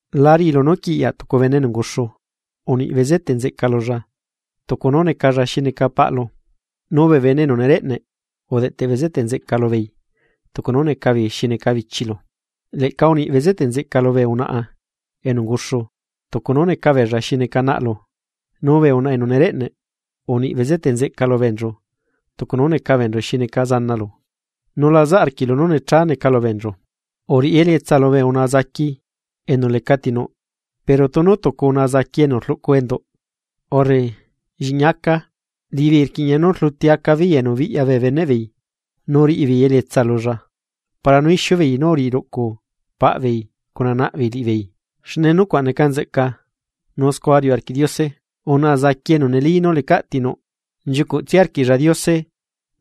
La riꞌilu nú quiꞌyaꞌ tucu bene enu unguxu uniꞌ bezeteꞌ nzeꞌca lulla tucu nú necalla xi neca paꞌlu, nu bee bene enu nereꞌneꞌ udeꞌteꞌ bezeteꞌ nzeꞌca lubeei tucu nú neca beei xi neca bichilu. Leꞌca uniꞌ bezeteꞌ nzeꞌca lubee unaꞌa enu unguxu tucu nú neca beella xi neca naꞌlu, nu bee unaꞌa enu nereꞌneꞌ, uniꞌ bezeteꞌ nzeꞌca lu beenchu tucu nú neca beenchu xi neca zanalu, nu la zaꞌ arquiꞌlu nú necha neca lu beenchu. Uriꞌi elietsa lubee unaꞌa zaqui enu lecaꞌti nuꞌ. Pero tunu tucu unaꞌa zaqui enu rluꞌcu enduꞌ urre lliꞌñi acaa, liꞌibeei rquiꞌña nú rluti acabeei enu biꞌya bee beneꞌ beei nu riꞌibeei elietsa lulla para nú ixiu beei nu uriꞌi ruꞌcu paꞌ beei cuna naꞌ beei liꞌibeei, xne nucuaꞌ neca nzeꞌca, nu scua riuꞌ arquiꞌ Diose. Unaꞌa zaqui enu neli nú lecaꞌ tinuꞌ, nchiucuꞌtsia arquiꞌlla Diose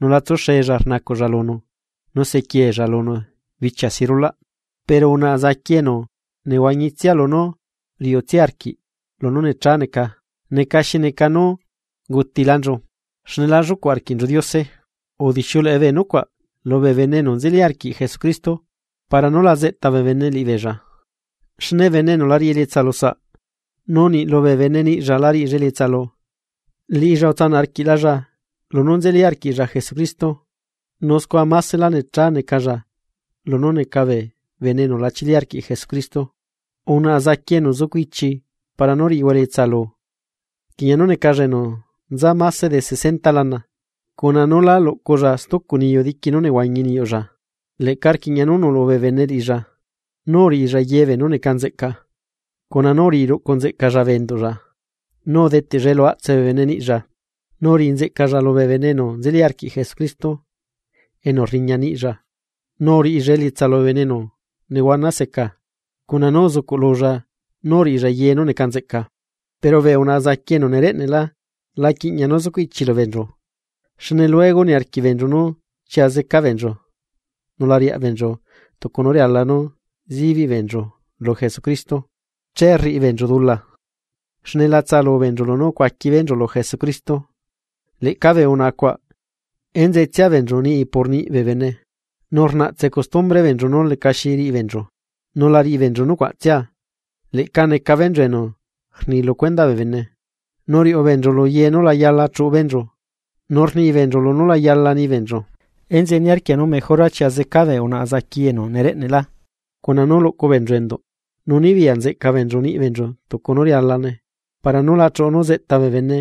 nu la tsuxella rnacuꞌlla lunu nu sequieella lunu bichia si rulaꞌ. Pero unaꞌa zaqui enu nehuañitsia lunú riuꞌtsia arquiꞌ lunú necha neca, neca xi neca nú ungutilanchu xne la llucuꞌ arquiꞌnchu Diose. Udixiuleꞌe bee nucuaꞌ lubee bene enu nzeli arquiꞌ Jesucristo, para nú la zeꞌta bee bene liꞌibeella. Xne bene enu la riꞌi elietsa lusaꞌ, nu niꞌ lubee bene niꞌlla la riꞌilla elietsalu, liꞌilla utsanaꞌ arquiꞌlalla lunú nzeli arquiꞌlla Jesucristoꞌ nu scua másela necha necalla lunú neca bee bene enu la chili arquiꞌ Jesucristo. Unaꞌa zaqui enu zucuichi para nú riꞌihua elietsalu, rquiꞌña nú necalla enu nza máse de sesenta lana cuna nú lá luꞌculla stucu niyu diqui nú nehuañi niyuꞌlla. Leꞌca rquiꞌña nú nuꞌlu bee bene liꞌilla nú uriꞌilla ye beenú neca nzeꞌca, cuna nú uriꞌi ruꞌcu nzeꞌcalla bee enduꞌlla, nu udeteꞌlla elu aꞌtse bee bene niꞌlla nu uriꞌi nzeꞌcalla lubee bene enu nzeli arquiꞌ Jesucristo enu rriña niꞌlla. Nu uriꞌilla elietsa lubee bene enu nehuana seca. Cuna nú uzucuꞌlulla nú uriꞌilla ye nú neca nzeꞌca. Pero bee unaꞌa zaqui enu nereꞌne'lá la quiꞌña nú zucuꞌ ichilu beenchu, xne luego niarquiꞌ beenchu nú chia zeca beenchu nu la riaꞌ beenchu tucu nú riala nú sibiꞌ beenchu lu Jesucristo. Che rriꞌi beenchu dula, xne la tsaꞌalu beenchu lunú ucuaqui beenchu lu Jesucristo. Leꞌca bee unaꞌa cuaꞌ enzetsia beenchu niꞌi por niꞌi bee bene, nu rnaꞌtse custumbre beenchu nú lecaxi riꞌi beenchu, nu la riꞌi beenchu nucuaꞌtsia, leꞌca neca beenchu enu rni lu cuendaꞌ bee bene. Nu riuꞌu beenchu lu ye nú la yala chuꞌu beenchu nu rni beenchu lunú la yala ni beenchu. Enzeꞌe niarquia nú mejora chia zeca bee unaꞌa zaqui enu nereꞌneꞌlá cuna nú luꞌcu beenchu enduꞌ, nu nibiyaꞌ nzeꞌca beenchu niꞌi beenchu tucu nú rialane para nú la chuꞌu nú zeꞌta bee bene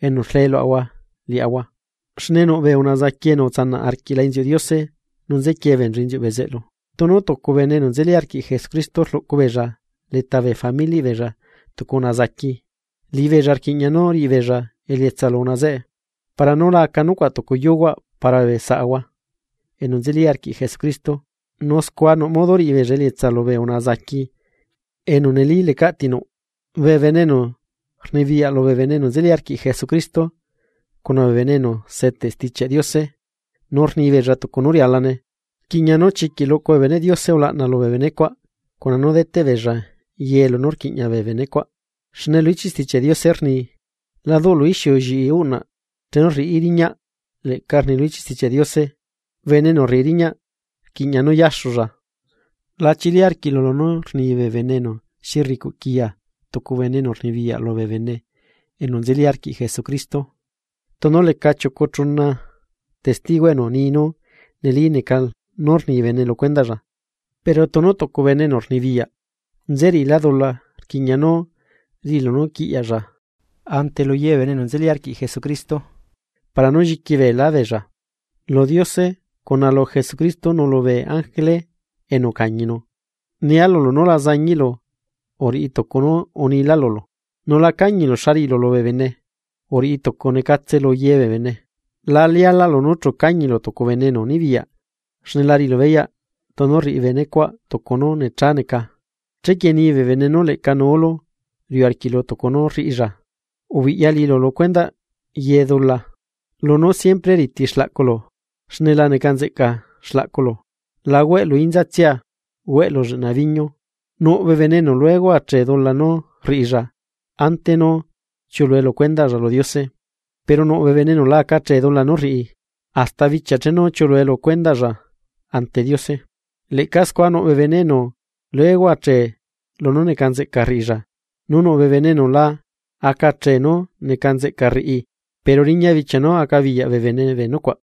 enu rlee luaꞌahua liaꞌahua. Xne nuꞌ bee unaꞌa zaqui enu utsanaꞌ arquiꞌla inziuꞌ Diose nu nzequie beenchu inziuꞌ bezeꞌlu. Tunu tucu bene enu nzeli arquiꞌ Jesucristo rluꞌcu beella leta bee familiaꞌ beella tucu unaꞌa zaqui, liꞌibeella rquiꞌña nú riꞌi beella elietsa lu unaꞌa zeꞌe, para nú la aca nucuaꞌ tucu yuhuaꞌ para bee saꞌahua enu nzeli arquiꞌ Jesucristo, nu scua nuꞌ modo riꞌi beella elietsa lubee unaꞌa zaqui enu neli lecaꞌ tinuꞌ. Bee bene enu rnibiyaꞌ lubee bene enu nzeli arquiꞌ Jesucristo cuna bee bene enu seteꞌ Stichiaꞌ Diose nu rnibeella tucu nú rialane, rquiꞌña nú chiquiꞌ luꞌcu bee beneꞌ Diose ulaꞌna lubee benecuaꞌ cuna nú deteꞌ beella ye lunú quiꞌña bee benecuaꞌ. Xne lu ichiꞌ Stichiaꞌ Diose rni: “La duꞌlu ixiu lliꞌi uꞌnaꞌ chenu rriꞌí riñaꞌ.” Leꞌca rni lu ichiꞌ Stichiaꞌ Diose: “Bene enu rriꞌi riñaꞌ rquiꞌña nú yaxulla.” La chili arquiꞌlu lunú rni bee bene enu nuꞌ xi rricuꞌ quiya tucu bene enu rnibiyaꞌ lubee bene enu nzeli arquiꞌ Jesucristo, tunu leca chiucu chuna testigo enu ni nú neli neca nú rni bene lu cuendaꞌlla. Pero tunu tucu bene enu rnibiyaꞌ nzeriꞌilá dula rquiꞌña nú riꞌilu nú quiꞌyaꞌlla ante lu ye bee bene enu nzeli arquiꞌ Jesucristo, para nú lliqui beelá beella. Lu Diose, cuna lu Jesucristo nu lubee ángele enu ucañinu, nia lulu nu la zañiꞌlu uriꞌi tucu nú unilá lulu, nu la cañilu xa rriꞌilu lubee bene uriꞌi tucunecatse lu ye bee bene. La lialaꞌlu nú chu cañilu tucu bene enu nibiyaꞌ, xne la riꞌilu beyaꞌ tunu rriꞌi benecuaꞌ tucu nú necha neca chequie ni bee bene nú leꞌca nuulu riuꞌ arquiꞌlu tucu nú rriꞌilla. Ubiꞌya liꞌilu lu cuendaꞌ ye dula. Lu nú siempre riti xlaꞌculu xne la neca nzeꞌca xlaꞌculu, la hueꞌlu inza tsia, hueꞌlu lleꞌna biñu. Nuꞌ bee bene enu luego achee dula nú rriꞌilla ante nú chiuꞌlue lu cuendaꞌlla lu Diose, pero nuꞌ bee bene enu la aca achee dula nú rriꞌi, hasta bichia chenu chiuꞌlue lu cuendaꞌlla ante Diose. Leꞌca scua nuꞌ bee bene enu luego achee lunú neca nzeꞌca rriꞌilla nu nuꞌ bee bene enu la aca chee nú neca nzeꞌca rriꞌi pero riña bichia nu acabiyaꞌ bee bene bee nucuaꞌ.